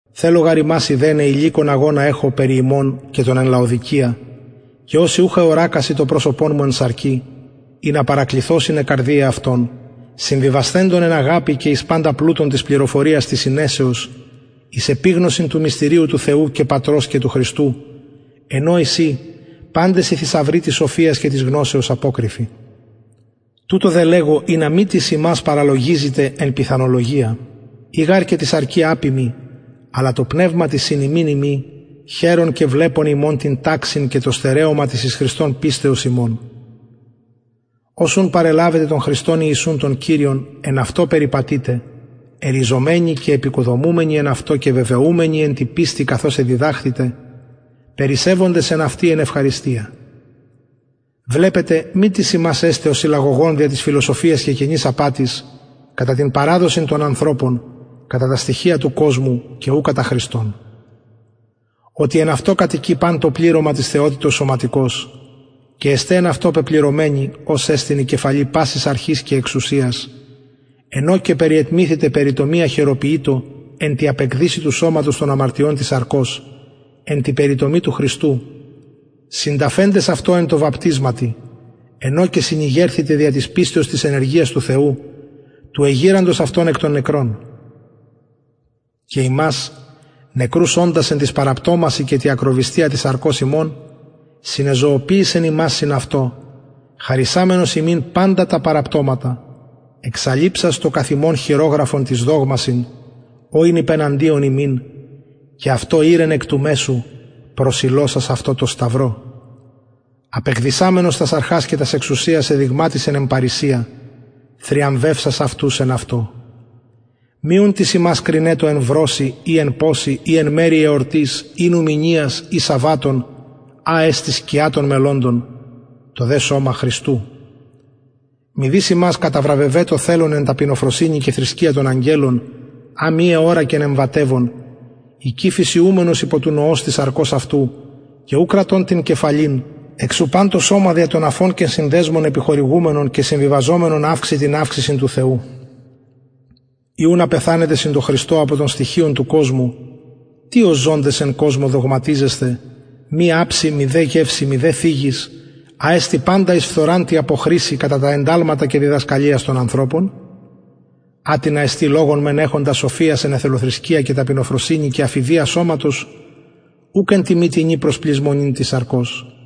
θελω γαρ υμας ειδεναι ηλικον αγωνα εχω περι υμων και των εν λαοδικεια και οσοι ουχ εωρακασιν το προσωπον μου εν σαρκι ινα παρακληθωσιν αι καρδιαι αυτων συμβιβασθεντων εν αγαπη και εις παντα πλουτον της πληροφοριας της συνεσεως εις επιγνωσιν του μυστηριου του θεου και πατρος και του χριστου εν ω εισιν παντες οι θησαυροι της σοφιας και της γνωσεως αποκρυφοι τουτο δε λεγω ινα μη τις υμας παραλογιζηται εν πιθανολογια ει γαρ και τη σαρκι απειμι αλλα τω πνευματι συν υμιν ειμι χαιρων και βλεπων υμων την ταξιν και το στερεωμα της εις χριστον πιστεως υμων ως ουν παρελαβετε τον χριστον ιησουν τον κυριον εν αυτω περιπατειτε ερριζωμενοι και εποικοδομουμενοι εν αυτω και βεβαιουμενοι εν τη πιστει καθως εδιδαχθητε περισσευοντες εν αυτη εν ευχαριστια βλεπετε μη τις υμας εσται ο συλαγωγων δια της φιλοσοφιας και κενης απατης κατα την παραδοσιν των ανθρωπων κατα τα στοιχεια του κοσμου και ου κατα χριστον οτι εν αυτω κατοικει παν το πληρωμα της θεοτητος σωματικως και εστε εν αυτω πεπληρωμενοι ος εστιν η κεφαλη πασης αρχης και εξουσιας εν ω και περιετμηθητε περιτομη αχειροποιητω εν τη απεκδυσει του σωματος των αμαρτιων της σαρκος εν τη περιτομη του χριστου συνταφεντες αυτω εν τω βαπτισματι εν ω και συνηγερθητε δια της πιστεως της ενεργειας του θεου του εγειραντος αυτον εκ των νεκρων και υμας νεκρους οντας εν τοις παραπτωμασιν και τη ακροβυστια της σαρκος υμων συνεζωοποιησεν υμας συν αυτω χαρισαμενος ημιν παντα τα παραπτωματα εξαλειψας το καθ ημων χειρογραφον τοις δογμασιν ο ην υπεναντιον ημιν και αυτο ηρκεν εκ του μεσου προσηλωσας αυτο τω σταυρω απεκδυσαμενος τας αρχας και τας εξουσιας εδειγματισεν εν παρρησια θριαμβευσας αυτους εν αυτω μη ουν τις υμας κρινετω εν βρωσει η εν ποσει η εν μερει εορτης η νουμηνιας η σαββατων α εστιν σκια των μελλοντων το δε σωμα χριστου μηδεις υμας καταβραβευετω θελων εν ταπεινοφροσυνη και θρησκεια των αγγελων α μη εωρακεν εμβατευων εικη φυσιουμενος υπο του νοος της σαρκος αυτου και ου κρατων την κεφαλην εξ ου παν το σωμα δια των αφων και συνδεσμων επιχορηγουμενον και συμβιβαζομενον αυξει την αυξησιν του θεου ει απεθανετε συν χριστω απο των στοιχειων του κοσμου τι ως ζωντες εν κοσμω δογματιζεσθε μη αψη μηδε γευση μηδε θιγης α εστιν παντα εις φθοραν τη αποχρησει κατα τα ενταλματα και διδασκαλιας των ανθρωπων ατινα εστιν λογον μεν εχοντα σοφιας εν εθελοθρησκεια και ταπεινοφροσυνη και αφειδια σωματος ουκ εν τιμη τινι προς πλησμονην της σαρκος